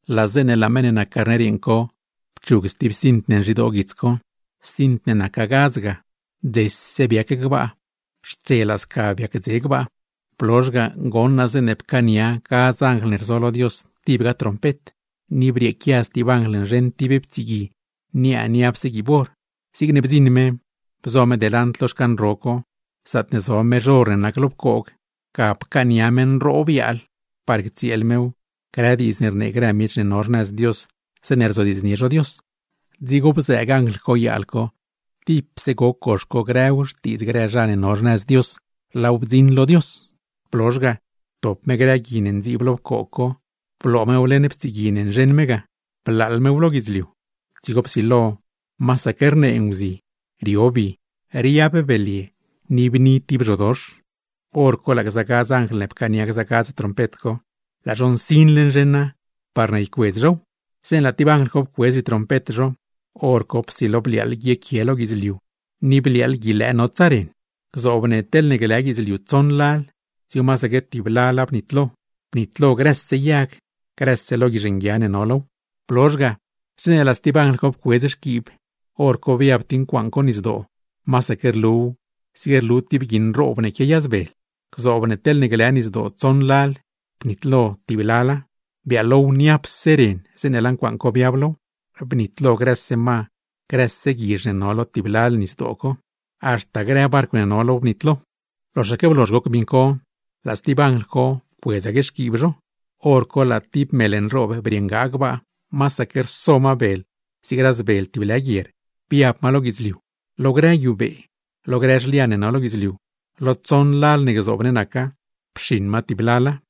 Laa zeeṉe laa meṉ ne nac Carner yeeṉ co pchug stib cint ne nzhidoo guits co, cint ne naca gadz ga, dzese biac gbaa; xtselaa sca biac dze gbaa. Blozh ga, goṉ naa zeeṉe pcaania gadz anjl ne rzo lo Dios, tibga trompet. Ni brieequia stib anjl nzheṉ tib ptsigui niaa niapse guiib or. Zigne bdziṉ me, bzo me delant lo xcan ro co, zaatne zo mezh or ne nac lo pcoog; ga pcaania me nroob yaal parne ctsieel mew grë diidz ne rnee grë miech ne no xnëz Dios zeeṉe rzodiidznie zho Dios. Dzigo bzëëg anjl co yaal co, tipse goc gox co grëw xtiidz grë zha ne no xnëz Dios, laaw bdziṉ lo Dios. Blozh ga, ptop me grë gui ne ndziib lo pcoog co bloo mew leṉ ptsigui ne nzheṉ me ga, blaaḻ mew lo guidzliu; dzigo psilo masaque rnee nguzi, rio bi, riab belye ne, ni bni tib zhodox. Horco laa gza gadz anjl ne pcaania gza gadz trompet co, laa zho nsinle nzheṉa, parne ycuedz zhow. Zeeṉe laa tib anjl co pcuedz zhitrompet zho, hor co psilo bliaaḻ guiequie lo guidzliu ni bliaaḻ guilëë notsa ren. Gzoob ne teḻne glë guidzliu tsoṉ lal, dzigo masaque tib lala bnitlo, bnitlo grëse yag, grëse lo guizh nguia ne no low. Blozh ga, zeeṉe laa stib anjl co pcuedz xquiib, hor co biab tib ncuaaṉ co nisdoo, masaque rluw zig rlu tib gui nroob ne quiayazbel. Gzoob ne teḻ glë nisdoo tsoṉ lal, bnitlo tib lala, biaalow niapse ren zeeṉe laa ncuaaṉ co biab low. Bnitlo grëse ma, grëse guizh ne no lo tib lalga nis co, haxta grë barcw ne no low bnitlo. Loxaque blozh goc miṉ co, laa stib anjl co pcuedzaque xquiib zho, hor co laa tib mel nroob briṉgaa gbaa, masaque rso ma bel zig razbel tib lë guier, biab ma lo guidzliu. Lo grë guiubee, lo grë zhlian ne no lo guidzliu, lo tsoṉ lal ne gzoob ne naca, pxiṉ ma tib lala.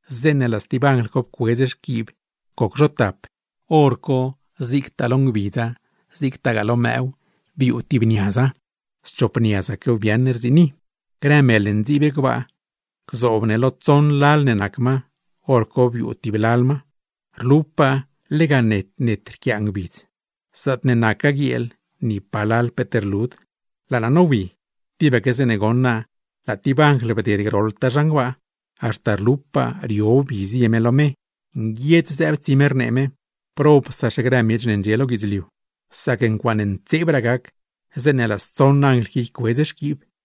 Zeeṉe laa stib anjl co pcuedz xquiib goc zho tap, hor co zigtaa lo ngbidza, zigtagaa lo mëëw, biuu tib niaza, schop niazaquew biaaṉ rziini; grë mel ne ndziib gbaa, gzoob ne lo tsoṉ lal ne nac ma, hor co biuu tib lal ma. Rlupaa lega net net rquiaa ngbidz; zaatne nacgaa guieel, ni palal peet rlud. Laa naa nowi, tibaque zeeṉe goṉ naa laa tib anjl bded groḻtaa zhan gbaa, haxta rlupaa rio bi zie me lo me, nguiedz zëëb tsi me rnee me: ―¡Probsaxe grë miech ne ndxie lo guidzliu! Sac ncuaaṉe ntseebraa gac, zeeṉe laa stsoṉ anjl qui ycuedz xquiib me.